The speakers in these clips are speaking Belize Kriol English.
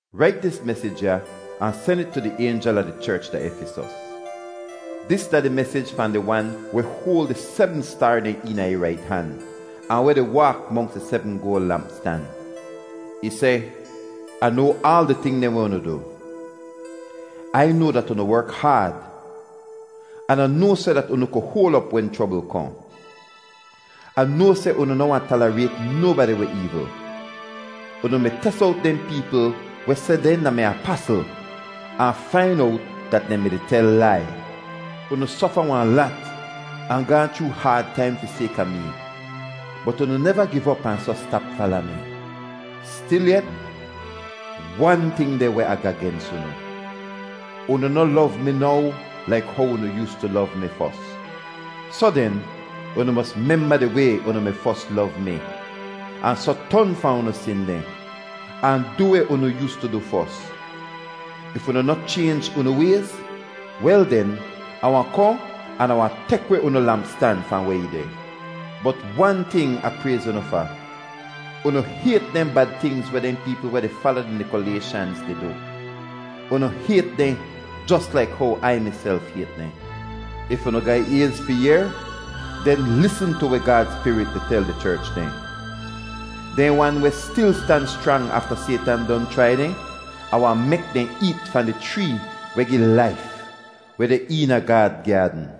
“Rait dis mesij ya ahn sen it tu di aynjel a di cherch da Efisos: Dis da di mesij fahn di Wan weh hoal di sebm staar dehn eena ih rait han ahn weh di waak monks di sebm goal lampstan. Ih seh: Ah noa aal di ting dehn weh unu du. Ai noa dat unu werk haad, an Ah noa seh dat unu ku hoal op wen chrobl kohn. Ah noa seh unu noh wahn talarayt nobadi weh eevl. Unu mi tes owt dehn peepl weh seh dehn da-mi apasl ahn fain owt dat dehn mi-di tel lai. Unu sofa wahn lat ahn gaahn chroo haad taim fi sayka mee bot unu neva giv op ahn soh stap fala mi. Stilyet, wan ting deh weh Ah ga gens unu: unu noh lov mi now laik how unu yoostu lov mi fos. Soh den, unu mos memba di way unu mi fos lov mi, ahn soh ton fahn unu sin dehn, ahn du weh unu yoostu du fos. If unu noh chaynj unu wayz, wel den, Ah wahn kohn an Ah wahn tek weh unu lampstan fahn weh ih deh. Bot wan ting Ah prayz unu fa. Unu hayt dehn bad tingz weh dehn peepl weh di fala di Nikolayshanz di du. Unu hayt dehn jos laik how Ai miself hayt dehn. If unu ga ayz fi yehr, den lisn tu weh Gaad Spirit di tel di cherch dehn. Dehn wan weh stil stan schrang afta Saytan don chrai dehn, Ah wahn mek dehn eet fahn di chree weh gi laif, weh deh eena Gaad gyaadn.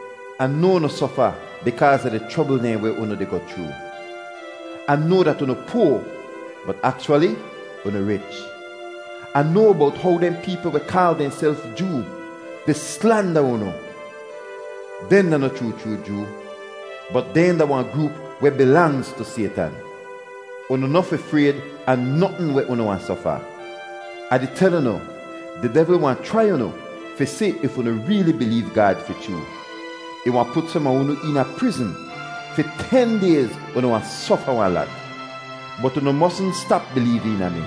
Ah noa unu sofa bikaaz a di chrobl dehn weh unu di goh chroo. Ah noa dat unu poa bot akchwali unu rich! Ah noa bowt how dehn peepl weh kaal dehnself Joo di slanda unu. Dehn da noh chroo chroo Joo, bot dehn da wahn groop weh bilangz tu Saytan. Unu noh fi frayd a notn weh unu wahn sofa. Ah di tel unu, di devl wahn chrai unu fi si if unu reeli bileev Gaad fi chroo. Ih wahn put som a unu eena prizn. Fi ten dayz unu wahn sofa wahn lat. Bot unu mosn stap bileev eena mi,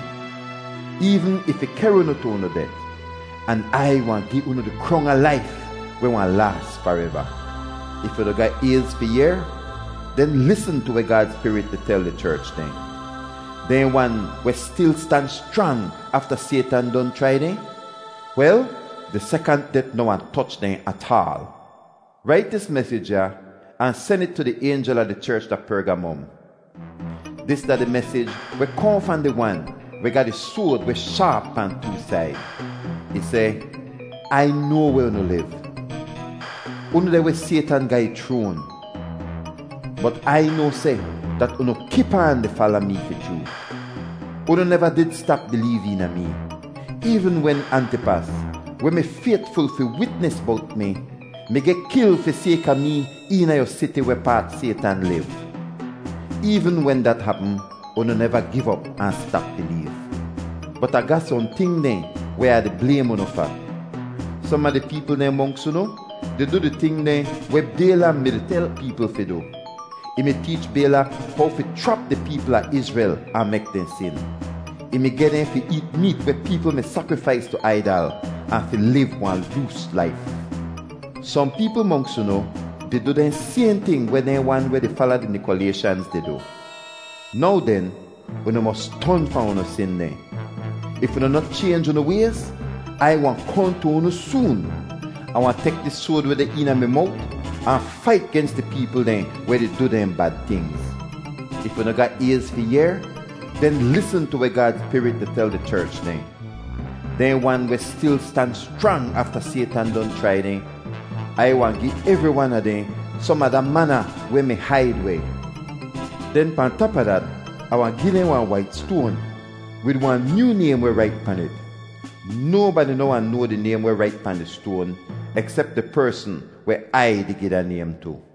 eevn if ih kehr unu tu unu det, an Ai wahn gi unu di krong a laif weh wahn laas fareva. If unu ga ayz fi yehr, den lisn tu weh Gaad Spirit di tel di cherch dehn. Dehn wan weh stil stan schrang afta Saytan don chrai dehn, wel di sekant det noh wahn toch dehn ataal. “Rait dis mesij ya ahn sen it tu di aynjel a di cherch da Pergamom: Dis da di mesij weh kohn fahn di Wan weh ga di soad weh shaap pahn too said. Ih seh: Ai noa weh unu liv. Unu deh weh Saytan ga ih chroan. Bot Ai noa seh dat unu kip aan di fala mee fi chroo. Unu neva did stap bileev eena mee, eevn wen Antipas, weh mi faytful fi witnis bowt mi, mi geh kil fi sayka mee eena yu siti wehpaat Saytan liv. Eevn wen dat hapm, unu neva giv op ahn stap bileev. Bot Ah ga sohn ting dehn weh Ah di blaym unu fa. Som a di peepl dehn monks unu di du di ting dehn weh Baylam mi-di tel peepl fi du. Ih mi teech Baylak how fi chrap di peepl a Izrel ahn mek dehn sin. Ih mi geh dehn fi eet meet weh peepl mi sakrifais tu aidal ahn fi liv wahn loos laif. Sohn peepl monks unu di du dehn sayhn ting weh dehn wan weh di fala di Nikolayshanz di du. Now den, unu mos ton fahn unu sin dehn. If unu noh chaynj unu wayz, Ai wahn kohn tu unu soon. Ah wahn tek dis soad weh deh eena mi mowt ahn fait gens di peepl dehn weh di du dehn bad tingz. If unu ga ayz fi yehr, den lisn tu weh Gaad Spirit di tel di cherch dehn. Dehn wan weh stil stan schrang afta Saytan don chrai dehn, Ai wahn gi evri wan a dehn som a da mana weh mi haid weh. Den pahn tap a dat, Ah wahn gi dehn wahn wait stoan wid wahn nyoo naym weh rait pan it. Nobadi noh wahn noa di naym weh rait pahn di stoan eksep di persn weh Ai di gi da naym tu.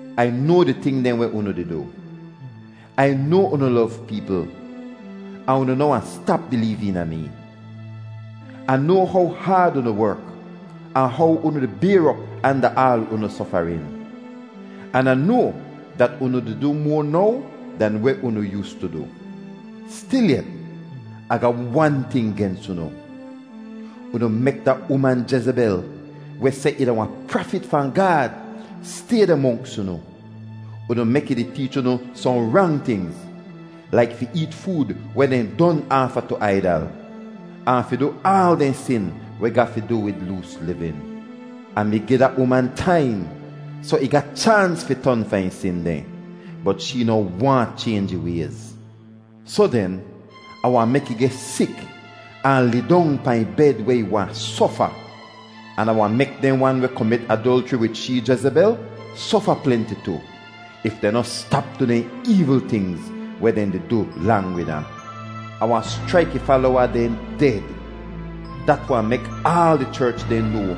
Ai noa di ting dehn weh unu di du. Ai noa unu lov peepl ahn unu noh wahn stap bileev eena mee. Ah noa how haad unu werk ahn how unu di bayr op anda aal unu sofarin. An Ah noa dat unu di du moa now dahn weh unu yoostu du. Stilyet, Ah ga wan ting gens unu. Unu mek da uman Jezebel, weh seh ih da wahn prafit fahn Gaad, stay deh monks unu. Unu mek ih di teech unu sohn rang tingz, laik fi eet food weh dehn don aafa tu aidal ahn fi du aal dehn sin weh ga fi du wid loos livin. Ah mi gi da uman taim soh ih ga chaans fi ton fahn ih sin dehn. Bot shee noh waahn chaynj ih wayz. Soh den, Ah wahn mek ih geh sik ahn lidong pahn ih bed weh ih wahn sofa. An Ah wahn mek dehn wan weh komit adolchri wid shee, Jezebel, sofa plenti tu, if dehn noh stap du dehn eevl tingz weh dehn di du lang wid ahn. Ah wahn schraik ih falowa dehn ded. Dat wahn mek aal di cherch dehn noa,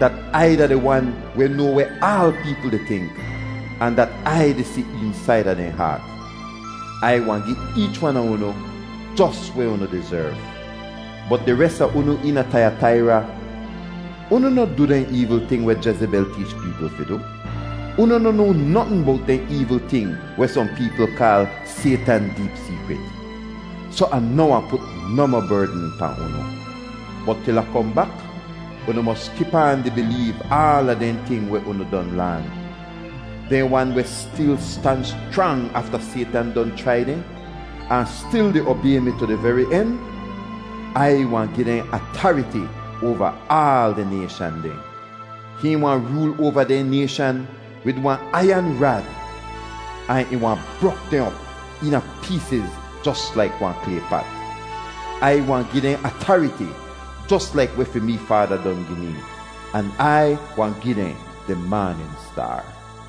dat Ai da di Wan weh noa weh aal peepl di tink ahn dat Ai di si eensaida dehn haat. Ai wahn gi eech wan a unu jos weh unu dizerv. Bot di res a unu eena Taiyataira, unu noh du dehn eevl ting weh Jezebel teech peepl fi du. Unu noh noa notn bowt dehn eevl ting weh sohn peepl kaal Saytan deep seekrit. Soh Ah noh wahn put nohmoh berdn pahn unu. Bot til Ah kohn bak, unu mos kip aan di bileev aala dehn ting weh unu don laan. Dehn wan weh stil stan schrang afta Saytan don chrai dehn ahn stil di obay mi tu di veri en, Ai wahn gi dehn atariti oava aal di nayshan dehn. ‘Hihn wahn rool oava dehn nayshan wid wahn aiyan rad, ahn ih wahn brok dehn op eena peesiz jos laik wahn klay pat.’ Ai wahn gi dehn atariti jos laik weh fi mee Faada don gi mee. An Ai wahn gi dehn di maanin staar.